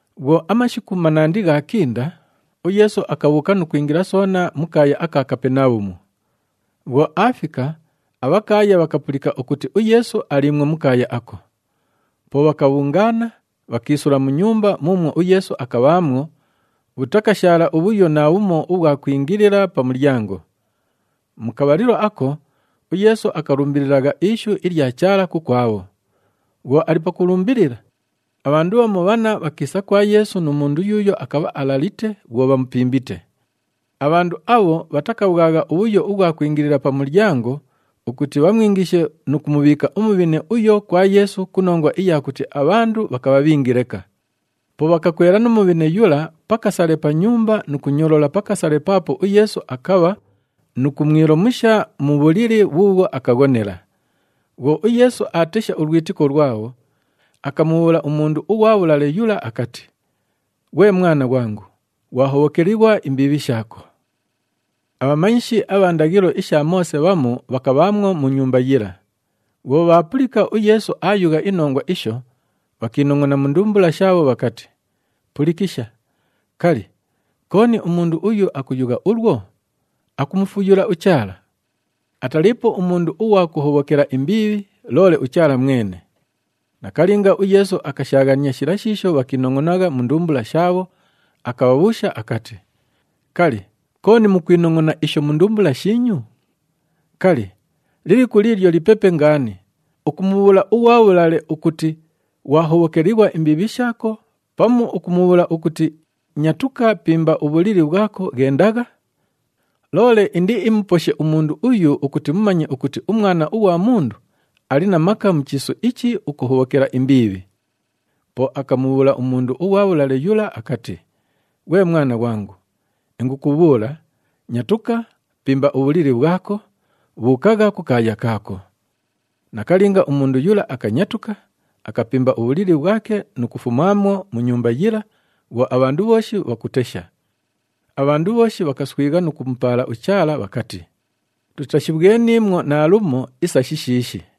Bhwo amashiku manandi ghaakinda, uYeesu akabhuuka nu kwingila soona mu kaaya aka Kapenabhumu. Bhwo aafika, abhakaaya bhakapulika ukuti uYeesu aliimwo mu kaaya ako. Po bhakabhungaana, bhakiisula mu nyumba muumwo uYeesu akabhaamwo, bhutakashaala ubhuyo naabhumo ubhwa kwingilila pa mulyango. Mu kabhalilo ako, uYeesu akalumbililagha ishu ilya Chaala kukwabho. Bhwo ali pakulumbilila, abhandu bhamu bhanna bhakiisa kwa Yeesu nu mundu yuuyo akabha alalite bhwo bhamupimbite. Abhandu abho bhatakabhwagha ubhuyo ubhwa kwingilila pa mulyango ukuti bhamwingishe nu kumubhiika umubhine uyo kwa Yeesu ku nongwa iya kuti abhandu bhakabha bhingi leka. Po bhakakwela nu mubhine yula pa kasale pa nyumba nu kunyolola pa kasale paapo uYeesu akabha nu kumwilomusha mu bhulili bhuubhwo akaghonela. Bhwo uYeesu aatesha ulwitiko lwabho, akamubhuula umundu ughwa bhulale yula akati, “Ghwe mwana ghwangu, ghwahobhokelighwa imbiibhi shaako.” Abhamanyishi abha ndaghilo isha Moose bhamu bhakabhaamwo mu nyumba yila. Bhwo bhaapulika uYeesu aayugha inongwa isho, bhakiinongʼona mu ndumbula shaabho bhakati, “Pulikisha! Kali, kooni umundu uyu akuyugha ulwo? Akumufuyula uChaala! Ataliipo umundu ughwa kuhobhokela imbiibhi, loole uChaala mwene.” Nakalinga uYeesu akashaaghania shila shiisho bhakiinongʼonagha mu ndumbula shaabho, akabhabhuusha akati, “Kali, kooni mukwinongʼona isho mu ndumbula shiinyu? Kali, liliku liilyo lipepe ngaani, ukumubhuula ughwa bhulale ukuti, ‘Ghwahobhokelighwa imbiibhi shaako,’ pamu ukumubhuula ukuti, ‘Nyatuka, pimba ubhulili bhwako, ghendagha’? Loole indiimuposhe umundu uyu ukuti mumanye ukuti uMwana ughwa Mundu ali na maka mu chiisu ichi ukuhobhokela imbiibhi.” Po akamubhuula umundu ughwa bhulale yula akati, “Ghwe mwana ghwangu, ingukubhuula, nyatuka, pimba ubhulili bhwako, bhuukagha kukaaya kaako.” Nakalinga, umundu yula akanyatuka, akapimba ubhulili bhwake nu kufumaamwo mu nyumba yila bhwo abhandu bhooshi bhakutesha. Abhandu bhooshi bhakaswigha nu kumupaala uChaala bhakati, “Tutashibhweniimwo naalumo isa shishiishi.”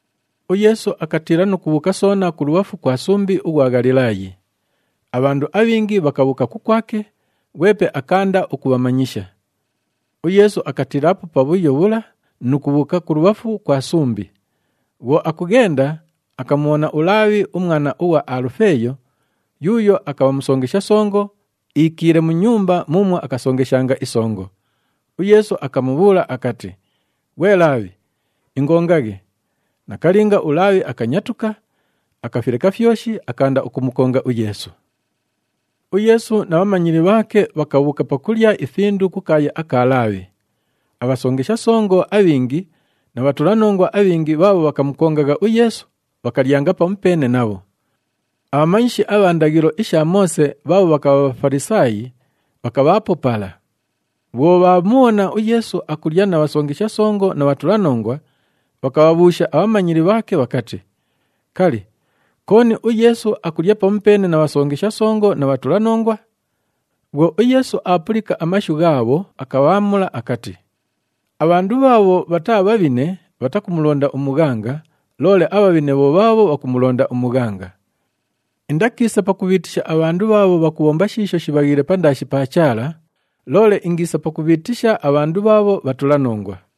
UYeesu akatiila nu kubhuuka soona kulubhafu kwa sumbi ughwa Ghalilaayi. Abhandu abhingi bhakabhuuka kukwake, ghwepe akaanda ukubhamanyisha. UYeesu akatiilaapo pabhuyo bhula nu kubhuuka kulubhafu kwa sumbi. Bhwo akughenda, akamubhona uLaabhi, umwana ughwa Alufeeyo, yuuyo akabha musongesha songo, iikiile mu nyumba muumwo akasongeshanga isongo. UYeesu akamubhuula akati, “Ghwe Laabhi, ingongaghe.” Nakalinga, uLaabhi akanyatuka, akafileka fyoshi, akaanda ukumukonga uYeesu. UYeesu na bhamanyili bhaake bhakabhuuka pakulya ifindu kukaaya aka Laabhi. Abhasongesha songo abhingi na bhatulanongwa abhingi bhaabho bhakamukongagha uYeesu bhakalyanga pamupeene nabho. Abhamanyishi abha ndaghilo isha Moose bhaabho bhakabha Bhafalisaayi, bhakabhaapo pala. Bhwo bhaamubhona uYeesu akulya na bhasongesha songo na bhatulanongwa, bhakabhabhuusha abhamanyili bhaake bhakati, “Kali, kooni uYeesu akulya pamupeene na bhasongesha songo na bhatulanongwa?” Bhwo uYeesu aapulika amashu ghaabho, akabhaamula akati, “Abhandu bhaabho bhataa bhabhine bhatakumulonda umughanga, loole abhabhine bho bhaabho bhakumulonda umughanga. Indakiisa pakubhiitisha abhandu bhaabho bhakubhomba shiisho shibhaghiile pandaashi pa Chaala, loole ingiisa pakubhiitisha abhandu bhaabho bhatulanongwa.”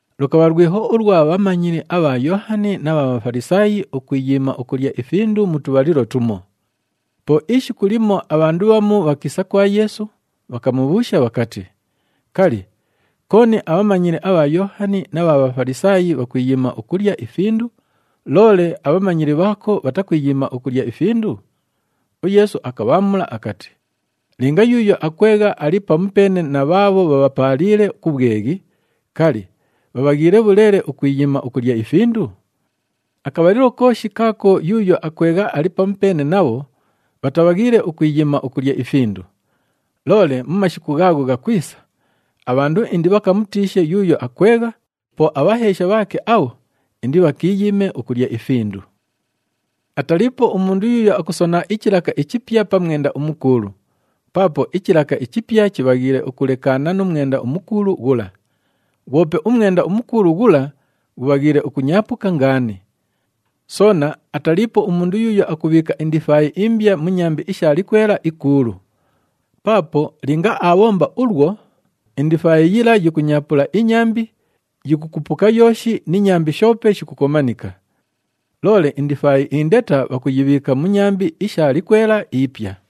Lukabha lwiho ulwa bhamanyili abha Yoohani na bha Bhafalisaayi ukwiyiima ukulya ifindu mu tubhalilo tumo. Po ishiku limo abhandu bhamu bhakiisa kwa Yeesu, bhakamubhuusha bhakati, “Kali, kooni abhamanyili abha Yoohani na bha Bhafalisaayi bhakwiyiima ukulya ifindu, loole abhamanyili bhaako bhatakwiyiima ukulya ifindu?” UYeesu akabhaamula akati, “Linga yuuyo akwegha ali pamupeene na bhaabho bhabhapaaliile ku bhweghi, kali, bhabhaghiile bhuleele ukwiyiima ukulya ifindu? Akabhalilo kooshi kaako yuuyo akwegha ali pamupeene nabho, bhatabhaghiile ukwiyiima ukulya ifindu. Loole mu mashiku ghaagho ghakwisa, abhandu indibhakamutiishe yuuyo akwegha, po abhaheesha bhaake abho indibhakiiyiime ukulya ifindu. “Ataliipo umundu yuuyo akusona ichilaka ichipya pa mwenda umukuulu. Paapo ichilaka ichipya chibhaghiile ukulekaana nu mwenda umukuulu ghula. Ghwope umwenda umukuulu ghula ghubhaghiile ukunyaapuka ngaani. Soona ataliipo umundu yuuyo akubhiika indifaayi imbya mu nyambi isha likwela ikuulu. Paapo linga aabhomba ulwo, indifaayi yila yikunyaapula inyambi, yikukupuka yooshi ni nyambi shoope shikukomanika. Loole indifaayi indeta bhakuyibhiika mu nyambi isha likwela ipya.”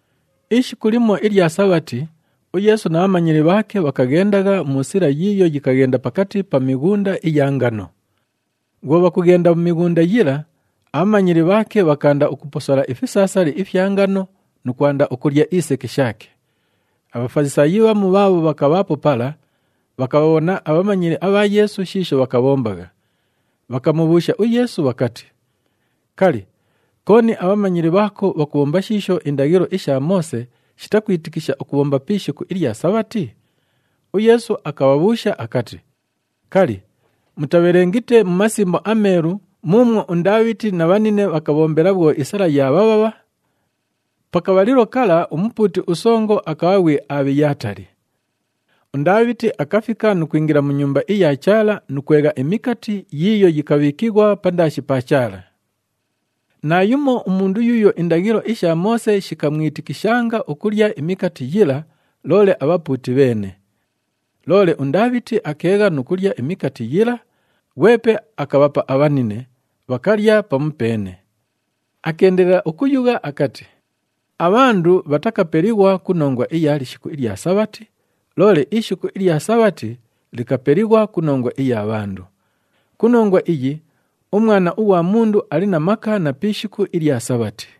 Ishiku limo ilya Sabhati, uYeesu na bhamanyili bhaake bhakaghendagha mu sila yiiyo yikaghenda pakati pa mighunda iya ngano. Bhwo bhakughenda mu mighunda yila, abhamanyili bhaake bhakaanda ukuposola ifisaasali ifya ngano nu kwanda ukulya iseke shaake. ABhafalisaayi bhamu bhaabho bhakabhaapo pala, bhakabhabhona abhamanyili abha Yeesu shiisho bhakabhombagha, bhakamubhuusha uYeesu bhakati, “Kali, kooni abhamanyili bhaako bhakubhomba shiisho indaghilo isha Moose shitakwitikisha ukubhomba pi ishiku ilya Sabhati?” UYeesu akabhabhuusha akati, “Kali, mutabhelengite mu Masimbo aMeelu muumwo uNdaabhiti na bhanine bhakabhombela bhwo isala yaabhabhabha? Pa kabhalilo kala umupuuti usongo akabha ghwi Abhiyatali. UNdaabhiti akafika nu kwingila mu Nyumba iya Chaala nu kwegha imikati yiiyo yikabhiikighwa pandaashi pa Chaala. Naayumo umundu yuuyo indaghilo isha Moose shikamwitikishanga ukulya imikati yila, loole abhapuuti bheene. Loole uNdaabhiti akeegha nu kulya imikati yila, ghwepe akabhapa abhanine, bhakalya pamupeene.” Akeendelela ukuyugha akati, “Abhandu bhatakapelighwa ku nongwa iya lishiku ilya Sabhati, loole ishiku ilya Sabhati likapelighwa ku nongwa iya bhandu. Ku nongwa iyi, uMwana ughwa Mundu ali na maka na pi ishiku ilya Sabhati.”